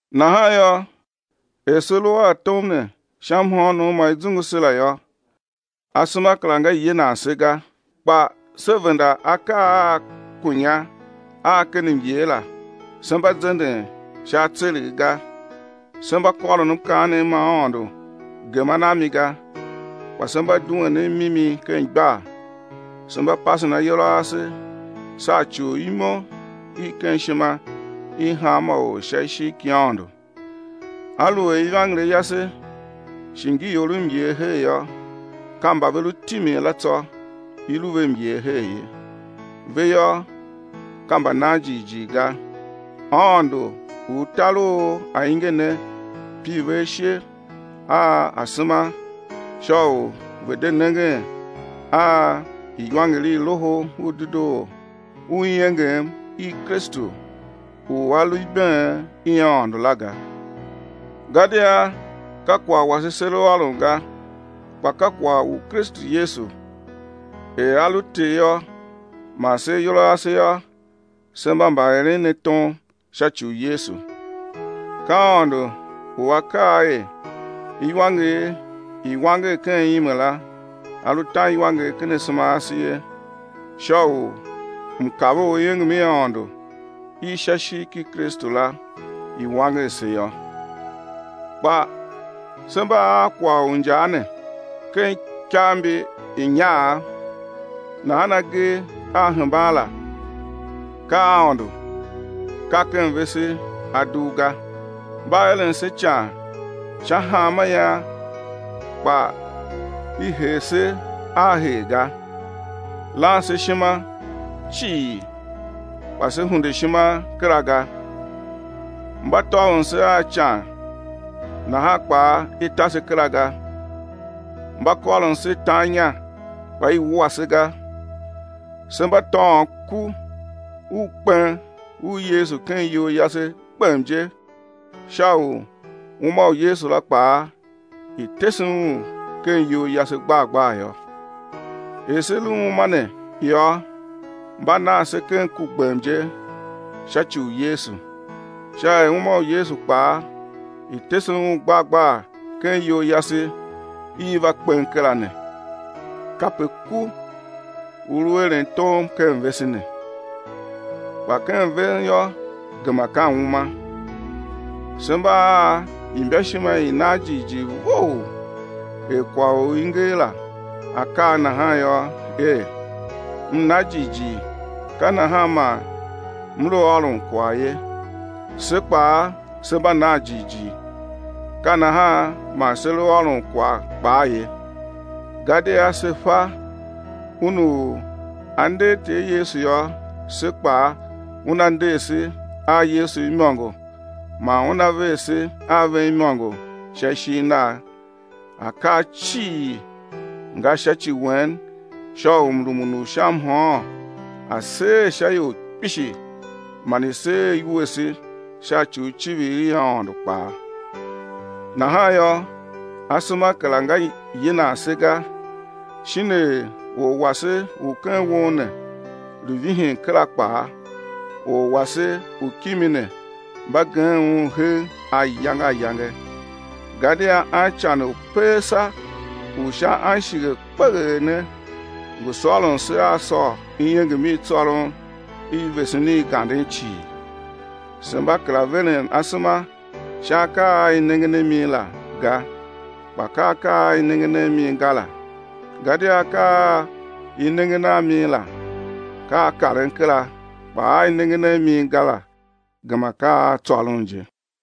Nahan yô, er se lu a tom ne sha mhôônom ma i zungu se la yô, asema kera nga yinan se ga. Kpa se venda akaa a kunya a ken myer la, se mba zenden sha atseregh ga, se mba kôron mkaanem ma Aôndo geman a mi ga, kpa se mba duen a mimi ken igbar, se mba pasen ayol a ase sha ci u imo i ken ishima i hanma or sha ishigh ki Aôndo. Aluer ivangeli yase shi ngi ior myer her yô, ka mba ve lu timin la tsô i lu ve myer her ye. Ve yô, ka mbanan jighjigh ga, aôndo u tar u ainge ne pir ve ashe a asema sha u ve̱ de nengen a iwanger i Loho u Dedoo u iengem i Kristu u A lu ibeen i Aôndo la ga. Gadia ka kwagh wase se lu ôron ga, kpa ka kwagh u Kristu Yesu, er A lu Ter yô, man se ayol a ase yô, se mba mbaeren ne tom sha ci u Yesu. Ka Aôndo u A kaa er, iwanger i̱ wanger ken ime la, A lu tan iwanger ken asema ase ye, sha u mkav u iengem i Aôndo i sha ishigh ki Kristu la i̱ wanger se yô. Kpa se mba a kwagh u injaa ne ken ikav mbi inyaav; nahan agee a hemban la ka a Aôndo, ka ken vese a dugh ga. Mba eren se ican sha hanma ian kpa i her se a her ga. Lan se ishima cii kpa se hunde ishima kera ga. Mba tôvon se a ican nahan kpaa i ta se kera ga. Mba kôron se tan inya, kpa i wua se ga. Se mba tôôn ku u kpen u Yesu ken iyol yase gbem je sha u uma u Yesu la kpaa i̱ tese un ken iyol yase gbar gbar yô. Er se lu uma ne yô, mba nan se ken ku gbem je sha ci u Yesu, sha er uma u Yesu kpaa, i̱ tese un gbar gbar ken iyol yase i va kpen kera ne. Kape ku u lu eren tom ken vese ne. Kpa ken ven yô, gema ka uma. Se mba a imbaishima i nan jighjigh vough er kwagh u i nger la a kaa nahan yô er: M na jighjigh, ka nahan man m lu ôron kwagh ye, se kpaa se mba nan jighjigh, ka nahan man se lu ôron kwagh kpaa ye. Gadia se fa, Un u A nder Ter Yesu yô, se kpaa, Una nder se a Yesu imôngo man Una ver se a ven imôngo sha ishigh Nagh. Akaa cii nga sha ci wen sha u mrumun u sha mhôôn a̱ seer sha ior kpishi man i̱ seer iwuese sha ci u icivir i Aôndo kpaa. Nahan yô, asema kera nga yinan se ga; shin er or wase u ken won ne lu vihin kera kpaa, or wase u kimi ne mba gem un hegh ayange ayange. Gadia ancan u peesa u sha anshighe kpeghee ne ngu sôron se a sôr iengem i tsôron i vesen i ganden cii. Se mba kera veren asema sha akaa a i nengen a mi la ga, kpa ka akaa a i nengen a mi ga la, gadia akaa a i nengen a mi la ka a karen kera, kpa a i nengen a mi ga la gema ka a tsôron je.